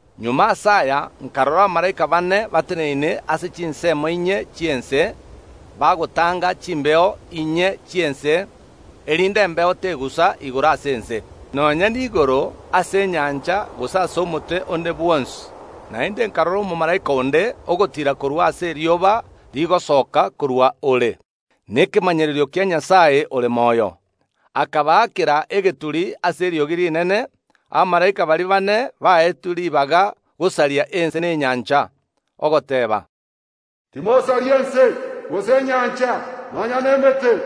Magega ase aya nkarora abamalaika baane bateneine ase chinsemo inye chi’ense, bagotanga chimbeo inye chi’ense, erinde embeo tegusa igoro ase ense, nonya niigoro ase enyancha gose ase omote onde bwonsi. Naende nkarora omomalaika onde ogotiira korwa aase erioba rigosoka korwa ore nekemanyererio kia Nyasae ore moyo; akabaakera egeturi ase eriogi rinene abamalaika baria baane baetwe ribaga gosaria ense na enyancha, ogoteeba, “Timosaria ense, gose enyancha, nonya nemete,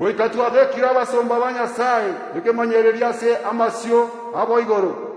goika twabekire abasomba ba Nyasae ekemanyererio ase amasio abo igoro.”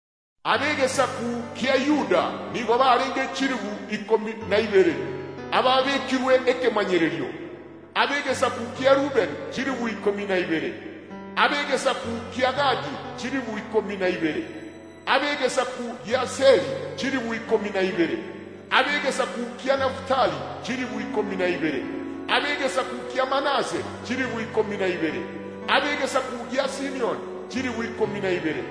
Ab’egesaku kia Yuda nigo barenge chilifu ikomi na ibere ababekirwe ekemanyererio, ab’egesaku kia Rubeni chilifu ikomi na ibere, ab’egesaku kia Gadi chilifu ikomi na ibere, ab’egesaku gi’Aseri chilifu ikomi na ibere, ab’egesaku kia Nafutali chilifu ikomi na ibere. Ab’egesaku kia Manase chilifu ikomi na ibere, ab’egesaku gia Simioni chilifu ikomi na ibere,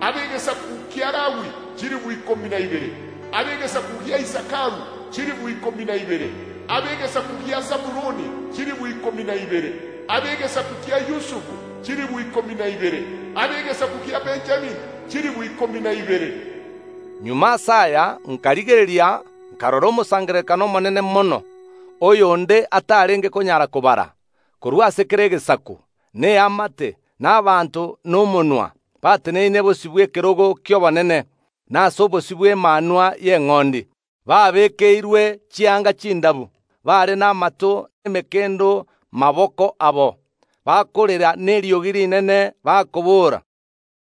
ab’egesaku kia Lawi chilifu ikomi na ibere, ab’egesaku gia Isakaru chilifu ikomi na ibere, ab’egesaku gia Sabuloni chilifu ikomi na ibere, ab’egesaku kia Yusufu chilifu ikomi na ibere, ab’egesaku kia Benjamini chilifu ikomi na ibere. Magega ase aya nkarigereria, nkarora omosangererekano omonene mono, oyo onde atarenge konyara kobara, korwa ase kera egesaku, na eamate, na abanto, na omonwa, bateneine bosio bw’ekerogo ki’obonene na ase obosio bw’Emanwa y’Eng’ondi, babeekeirwe chianga chindabu bare namato ’emekendo maboko abo, bakorera neriogi rinene, bakobora,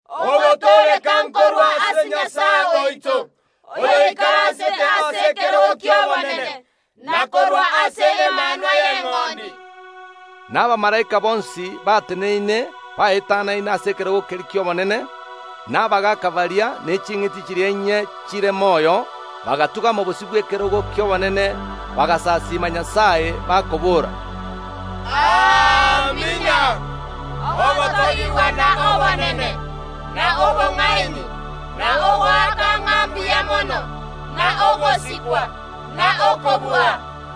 “Ogotooreka nkorwa ase Nyasae oito, oyoikaransete ase ekerogo ki’obonene, na korwa ase Emanwa y’Eng’ondi!” Na abamalaika bonsi bateneine baetanaine ase ekerogo keria ki’obonene, na abagaaka baria, ne ching’iti chiria inye chire moyo; bagatung’ama bosio bw’ekerogo ki’obonene, bagasasiima Nyasae, bakobora, “Amina! Ogotogigwa na obonene, na obong’aini, na ogoaka ng’a mbuya mono, na ogosikwa, na okobua,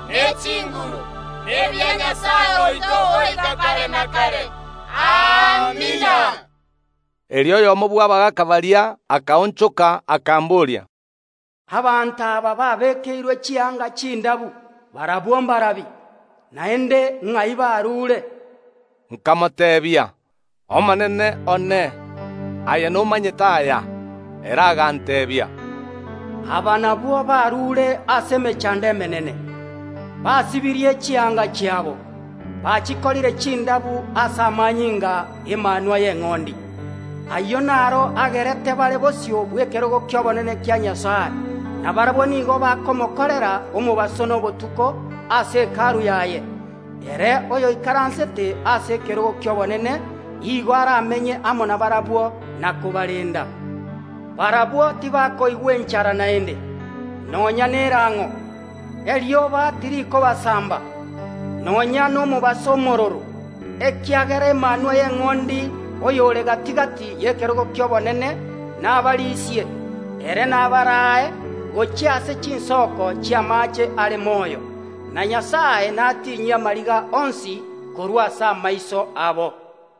ne chinguru, nebia Nyasae oito goika kare na kare. Amina.” Erio oyomo bw’abagaaka baria akaonchoka, akambooria, “Abanto aba babeekeirwe chianga chindabu barabwo mbarabi, naende ng’ai barure?” Nkamoteebia, “Omonene one, aye nomanyete aya.” Ere aganteebia, Aba nabwo barure ase emechando emenene, basibirie chianga chiabo, bachikorire chindabu ase amanyinga ’Emanwa y’Eng’ondi. Ayio naro agerete bare bosio bw’ekerogo ki’obonene kia Nyasae, na barabwo nigo bakomokorera omobaso na obotuko ase Hekalu yaye; ere oyoikaransete ase ekerogo ki’obonene igo aramenye amo nabarabwo na kobarenda. Barabwo tibakoigwa enchara naende, nonya nerang’o; erioba tirikobasamba, nonya nomobaso omororo, ekiagera Emanwa y’Eng’ondi oyore gati‐gati y’ekerogo ki’obonene nabarisie, ere nabaraae gochia ase chinsoko chi’amaache are moyo, na Nyasae natinyie amariga onsi korwa ase amaiso abo.